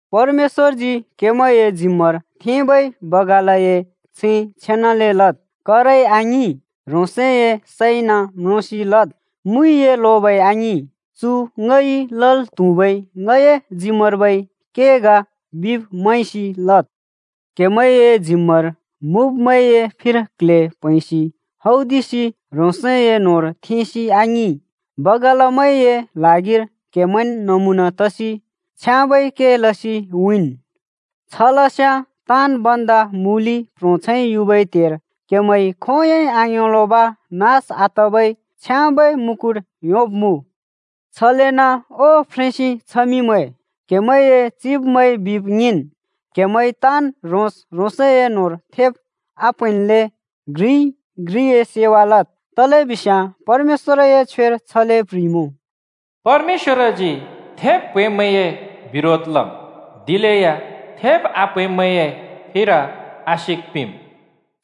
परमेश्‍वरजी क्‍हेमैंए जिम्‍मार थेंबै बगालए छैं छेनाले लद्। करइ आङिं, ह्रोंसए सैंइन म्रोंसि लद्। मुइए लोबै आङिं, चु ङइ लल् त्हुबै ङए जिम्‍मार्बै के ग बिब् मैंसि लद्। क्‍हेमैंए जिम्‍मार मुँब्‍मैंए फिर कल्हे प्हैंसि हौदिसि ह्रोंसए न्होंर थेंसि आङिं, बगालमैंए ल्हागिर क्हेमैंन् नमुना तसि छ्याँबै के लसि उँइँन्। छलस्याँ ताँन् भन्दा मूलि प्‍ह्रोंछैं युबै त्हेर क्‍हेमैंइ खोंयोंइ आङ्योंलोंब नास आतबै छ्याँबै मुकुट योंब्‍मुँ। छलेन ओ फ्रेंसि छमिमैं, क्हेमैंए चिब्मैंइ बिब् ङिंन्। क्‍हेमैं ताँन् ह्रोंस ह्रोंसए न्होंर थेब् आप्हैंन्ले घ्रिइ घ्रिए सेवा लद्, तलेबिस्याँ परमेश्‍वरए छ्वेर छले प्ह्रिइमुँ: “परमेश्‍वरजी थेब् प्हैंब्मैंए बिरोध लम्, दिलेया थेब् आप्हैंब्मैंए फिर आशिक पिंम्।”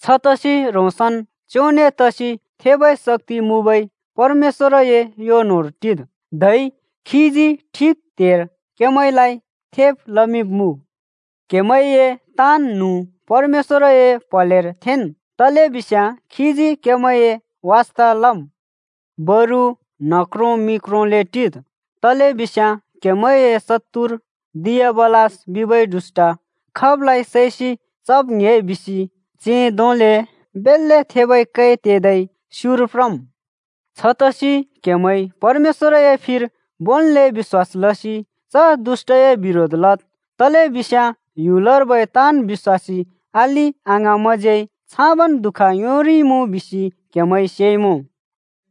छतसि ह्रोंसन् च्‍योंने तसि थेबै शक्‍ति मुँबै परमेश्‍वरए यो न्होंर टिद्, धै खीजी ठिक त्हेर क्‍हेमैंलाइ थेब् लमिंब्‍मुँ। क्‍हेमैंए ताँन् न्हुँ परमेश्‍वरए प्हलेर थेंन्, तलेबिस्याँ खीजी क्‍हेमैंए वास्ता लम्। बरु न्ह क्रों मि क्रोंले टिद्, तलेबिस्याँ क्‍हेमैंए शत्तुर दियाबलस बिबै दुष्‍ट खाबलाइ सैसि चब् ङ्‍हे बिसि सिंह धोंले बेल्‍ले थेबै कै तेदै स्युर प्रम्। छतसि क्‍हेमैं परमेश्‍वरए फिर भोंन्ले बिश्‍वास लसि च दुष्‍टए बिरोध लद्, तलेबिस्याँ ह्‍युलर्बै ताँन् बिश्‍वासी अलि अङाँमैंज्यै छाबन् दुःख योंरिइमुँ बिसि क्हेमैंइ सेइमुँ।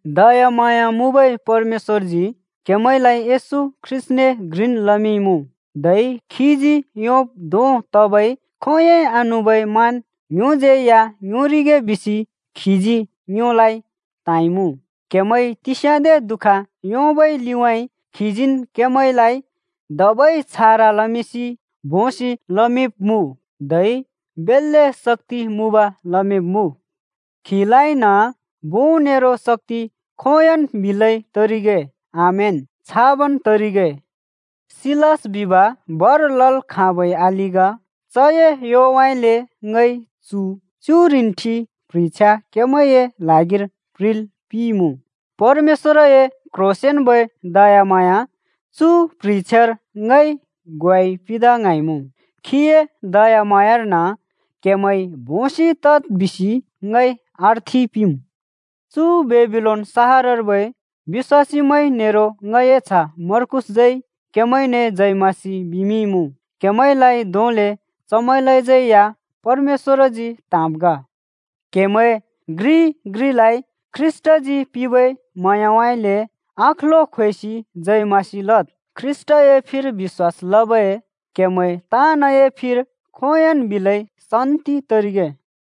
दयाम्हाँया मुँबै परमेश्‍वरजी क्हेमैंलाइ येशू ख्रीष्‍टने घ्रिन् लमिंइमुँ, धै खीजी योंब् धों तबै खोंयोंइ आनुबै मान ङ्योज्यै या योंरिगे बिसि खीजी ङ्योलाइ त्‍हाँइमुँ। क्‍हेमैंइ तिस्याँदे दुःख योंबै लिउँइँ खीजीन् क्हेमैंलाइ धबै छारा लमिंसि, भोंसि लमिंब्मुँ धै बेल्‍ले शक्‍ति मुँब लमिंब्‍मुँ। खीलाइन भों नेरो शक्‍ति खोंयोंन् बिलै तरिगे। आमेन, छाबन् तरिगे। सिलास बिब भर लल् खाँबै अलि ग। चए योउँइँले ङइ चु च्‍युरिन्ठि प्ह्रिछ्या क्‍हेमैंए ल्हागिर प्ह्रिल् पिंइमुँ। परमेश्‍वरए क्ह्रोंसेंन्बै दयाम्हाँया चु प्ह्रिछ्यार ङइ ग्वाइ पिंदा ङ्हाँइमुँ। खीए दयाम्हाँयार्न क्हेमैं भोंसि तद् बिसि ङइ अर्थि पिंम्। चु बेबिलोन सहरर्बै बिश्‍वासीमैं नेरो ङए च्ह मर्कूसज्यै क्‍हेमैंने जय मसीह बिमिंइमुँ। क्‍हेमैंलाइ धोंले चमैंलाज्यै या परमेश्‍वरजी त्‍हाँब् ग। क्‍हेमैं घ्रिइ घ्रिलाइ ख्रीष्‍टजी पिंबै म्हाँयाउँइँले अँखलो ख्वेसि जय मसीह लद्। ख्रीष्‍टए फिर बिश्‍वास लबै क्हेमैं ताँनए फिर खोंयोंन् बिलै शान्‍ति तरिगे।